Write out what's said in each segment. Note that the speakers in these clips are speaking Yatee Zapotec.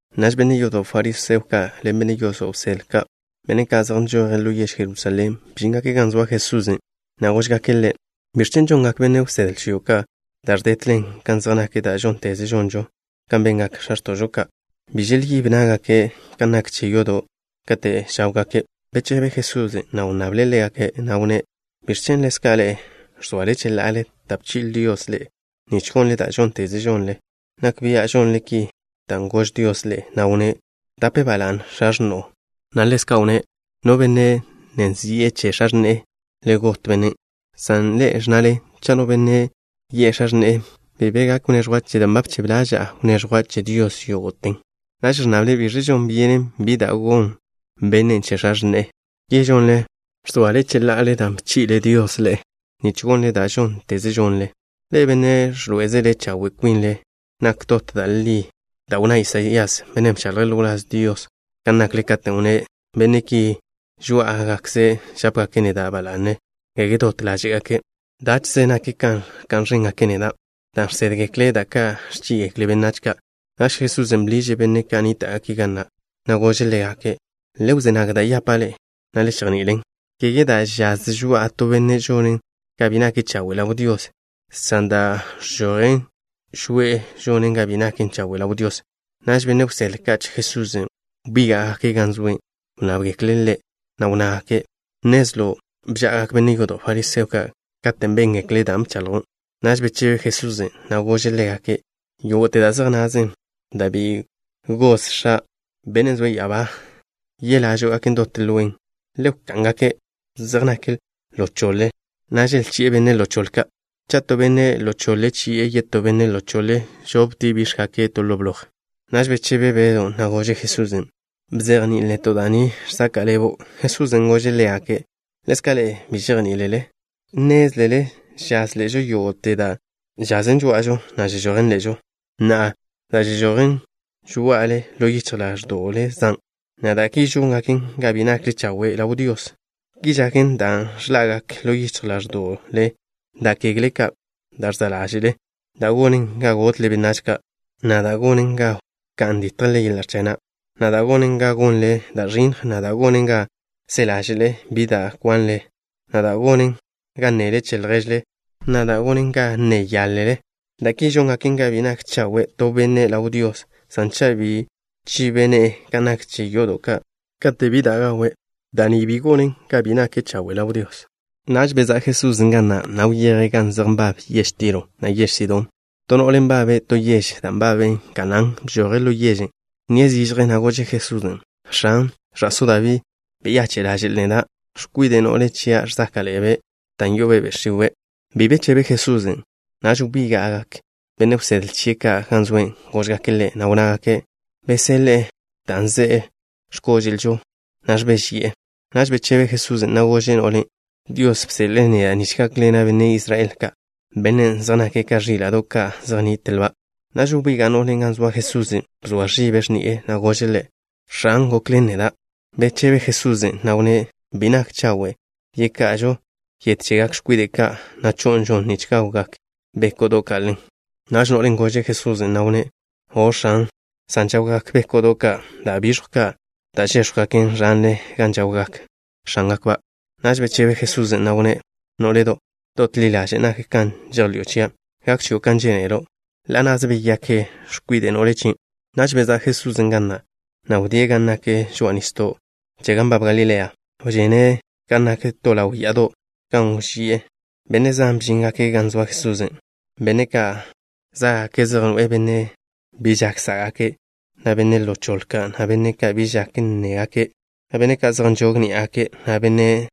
Naž benne' yodo' fariseo ka' len benne' yodo' wsedle ka', benne' ka' zej nžoje' ḻo yež Jerusalén, bžíngake' gan zoa Jesusen', na' góžgake' Ḻe': —¿Biẕ chen' žongak benne' wsedle chio' ka' da' ẕdetlen kan zej nak da' žónteze žonžo kan bengak x̱a x̱to'žo ka'? Bi želyíb ná'gake' kan nak che yodo' kate' za' gáwgake'. Bechebe Jesusen', na' wnnable' ḻégake', na' wnné': —¿Biẕ chen' ḻezka' ḻe'e ẕzoale cheḻa'ale da' bchi'le Dios ḻe'e, nich gonle da' žónteze žonle? Nak bia' žonle ki dan' gož Dios ḻe'e, na' wnné': “Wdape ba la'ne x̱a x̱no'o” na' ḻezka' wnné': “No benne' nne zi'e che x̱a x̱ne'e, le got bennen'.” San ḻe'e ẕnnale: “Cha' no benne' yi'e x̱a x̱ne'e: Bi be gak wneẕjwa' chele dan' ba bchebe ḻaža'a wneẕjwa' che Dios yógo'ten'.” Naž ẕnnale biž žon byenen bi da' gon bennen' che x̱a x̱ne'e. Ki žonle, ẕzoale cheḻa'ale dan' bchi'le Dios ḻe'e, nich gonle da' žónteze žonle. Ḻe'e, benne' ẕḻoé'ezele chawe' kwinle, nak dot da' li da' wnná Isaías, bennen' bchaḻje' ḻo wláz Dios, kan nakle, katen' wnné': Benne' ki, žoá'agakze' žápegake' neda' ba la'ne, kege dot ḻáže'gake'. Dáche'ze nak kan ẕka'n ẕéngake' neda' dan' žsédgekle' da ka' ẕchí'igekle benách ka'. Naž Jesusen' bḻiže' benne' ka' nníta'gake' ga na', na' gože' ḻégake': —Le wzé nag da' yapa' ḻe'e, na' le chejni'ilen. Kege da' žaz žoa'a to benne' žonen ga bi nake' chawe' ḻaw Dios, san da' ẕžojen žoe'e žonen ga bi nake' chawe' ḻaw Dios. Naž benne' wsedle ka' che Jesusen' wbíga'gake' gan zoe'. Wnnábgekle' Ḻe', na' wnnágake': —¿Nnezlo' bža'agak benne' yodo' fariseo ka' katen' béngekle' dan' bchaḻjo'? Naž bechebe Jesusen', na' gože' ḻégake': —Yógo'te da' zej nazen, da' bi goz X̱a', Bennen' zoe' ya'abá, yelážo'gaken dot lwen. Le wká'n-gake'. Zej nake' ḻo choḻe, na' želchi'e benne' ḻo choḻe ka'. Cha' to benne' ḻo choḻe chi'e yetó benne' ḻo choḻe, žoptie' bíx̱gake' to ḻo bloj. Naž bechebe Bedw, na' gože' Jesusen': —Bzejní'il neto' da' ni žsaka' ḻebo'. Jesusen' gože' ḻégake': —¿Ḻezka' ḻe'e bi žejní'ilele? Nnézlele žaz ḻe'žo yógo'te da' žazen žoá'ažo, na' žežojen ḻe'žo. Na'a, da' žežojen žoá'ale, ḻo yichj ḻáẕdo'le zan', na' da' ki žóngaken ga bi nakle chawe' ḻaw Dios. Ki žaken dan' ẕḻa'gak ḻo yichj ḻáẕdo'le da' kegle ka' da' ẕza' ḻáže'le, da' gonen ga gotle benách ka', na' da' gonen ga wká'n ditjle yeḻa' ẕchag na', na' da' gonen ga gonle da' ẕinnj, na' da' gonen ga se ḻáže'le bi da' kwanle, na' da' gonen ga nnele che lježle da' bi zej naken da' li, na' da' gonen ga nne yáḻele. Da' ki žóngaken ga bi nak chawe' to benne' ḻaw Dios, san cha' bi chibe' ne'e kan nak che yodo' kate' bi da' gawe', da' ni bi gonen ga bi nake' chawe' ḻaw Dios. Naž bezá' Jesusen' ga na', na' wyeje' gan zej nbab yež Tiro, na' yež Sidón. To no'le nbabe' to yež da' nbaben Kanaán bžoje' ḻo yežen'. Wnníe' zižje, na' gože' Jesusen': —X̱an, ẕa'só Dabí, beyache' ḻaže'l neda'. X̱kwide' no'le chia' ẕzáka'ḻe'ebe' dan' yo'obe' be' x̱iwe'. Bi be bechebe Jesusen'. Naž wbíga'gak benne' wsedle chie' ka' gan zoe'. Góžgake' Ḻe', na' wnnágake': —Beseḻe' ḻe', dan' ze'e x̱kóže'lžo na' ẕbéžeyi'e. Naž bechebe Jesusen', na' gože' no'len': —Dios bseḻe'e neda' nich gákḻena' benne' Israel ka', benne' zej nake' ka ẕíla'do' ka' zej nnitlba'. Naž wbiga' no'len' gan zoa Jesusen'. Bzoa ẕibe' x̱ni'e, na' gože' Ḻe': —X̱an, gokḻen neda'. Bechebe Jesusen', na' wnné': —Bi nak chawe' yeka'ažo yet chegak x̱kwide' ka', na' cho'nžon nich gawgak bé'ko'do' ka' ḻen. Naž no'len' gože' Jesusen', na' wnné': —O', X̱an, san žawgak bé'ko'do' ka' da' biẕjw ka', da' žéx̱jwgaken ẕanle gan žawgak x̱ángakba'. Naž bechebe Jesusen', na' wnné': —Nó'ledo'. Dot ḻi ḻaže' nak kan žejḻi'o chia'. Gak chio' kan žénelo'. Ḻa' na'ze beyakte x̱kwide' no'le chien'. Naž bezá' Jesusen' ga na', na' wdíe' gan nak žoa'a nisdo' che gan nbab Galilea. Wžene' gan nak to ḻaw ya'ado', gan wži'e. Benne' zan bžíngake' gan zoa Jesusen', benne' ka' zá'gake' zej noe'e benne' ka' bi žak sá'gake', na' benne' ḻo choḻe ka', na' benne' ka' bi žak nnégake', na' benne' ka' zej nžog ni'a ná'gake', na' benne'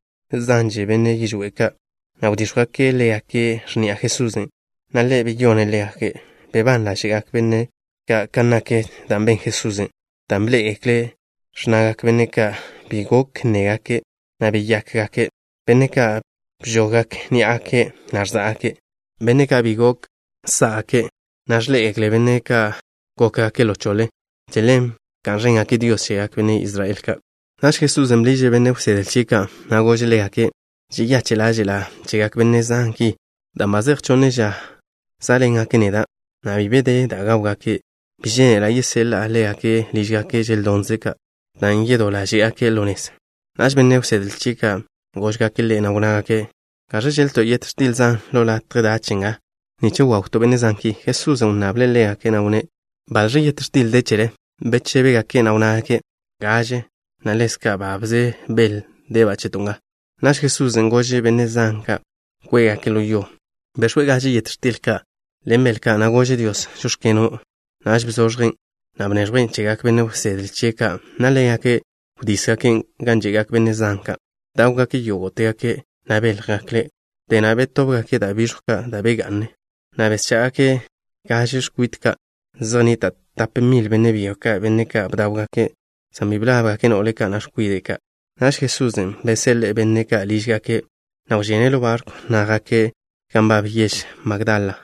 zanže, benne' yižwé' ka', na' wdíx̱jwgake' ḻégake' x̱ni'a Jesusen', na' Ḻe' beyone' ḻégake'. Bebán ḻáže'gak benne' ka' kan nak da' ben Jesusen', dan' bḻé'egekle' ẕnnagak benne' ka' bi gok nnégake', na' beyakgak benne' ka' bžoggak ni'a ná'gake', na' ẕza'gak benne' ka' bi gok sá'gake', na' ẕḻé'egekle benne' ka' gókgake' ḻo choḻe. Che ḻen bka'n ẕéngake' Dios chegak benne' Israel ka'. Naž Jesusen' bḻiže' benne' wsedle chie' ka', na' gože' ḻégake': —Žeyache' ḻáže'la' chegak benne' zan ki, dan' ba zej chonne ža zá'ḻengake' neda', na' bi be de da' gáwgake'. Bi žénela' yeseḻa' ḻégake' lížgake' želdonze' ka', dan' yedó ḻáže'gake' ḻo nez. Naž benne' wsedle chie' ka' góžgake' Ḻe', na' wnnágake': —¿Gaẕ žéḻ-leto' yet x̱til zan ḻo latje dach nga, nich wawto' benne' zan ki? Jesusen' wnnable' ḻégake', na' wnné': —¿Baḻx̱ yet x̱til de chele? Bechébegake', na' wnnágake': —Gaže, na' ḻezka' babze bel deba' cheto' nga. Naž Jesusen' gože' benne' zan ka' kwé'gake' ḻo yo. Bex̱we' gaže yet x̱til ka' ḻen bel ka', na' gože' Dios: “Žóx̱keno'.” Naž bzoẕjen', na' bneẕjwen' chegak benne' wsedle chie' ka', na' ḻégake' wdísgaken' gan že'gak benne' zan ka'. Bdáwgake' yógo'tegake', na' béljegekle'. Wdé na' betóbgake' da' biẕjw ka' da' begá'ngaken, na' beschá'gake' gaže x̱kwit ka'. Zej nnita' tap mil benne' byo ka', benne' ka' bdáwgake', san bi blábgake' no'le ka', na' x̱kwide' ka'. Naž Jesusen' beseḻe'e benne' ka' lížgake', na' wžene' ḻo barkwn', na' jake' gan nbab yež Magdala.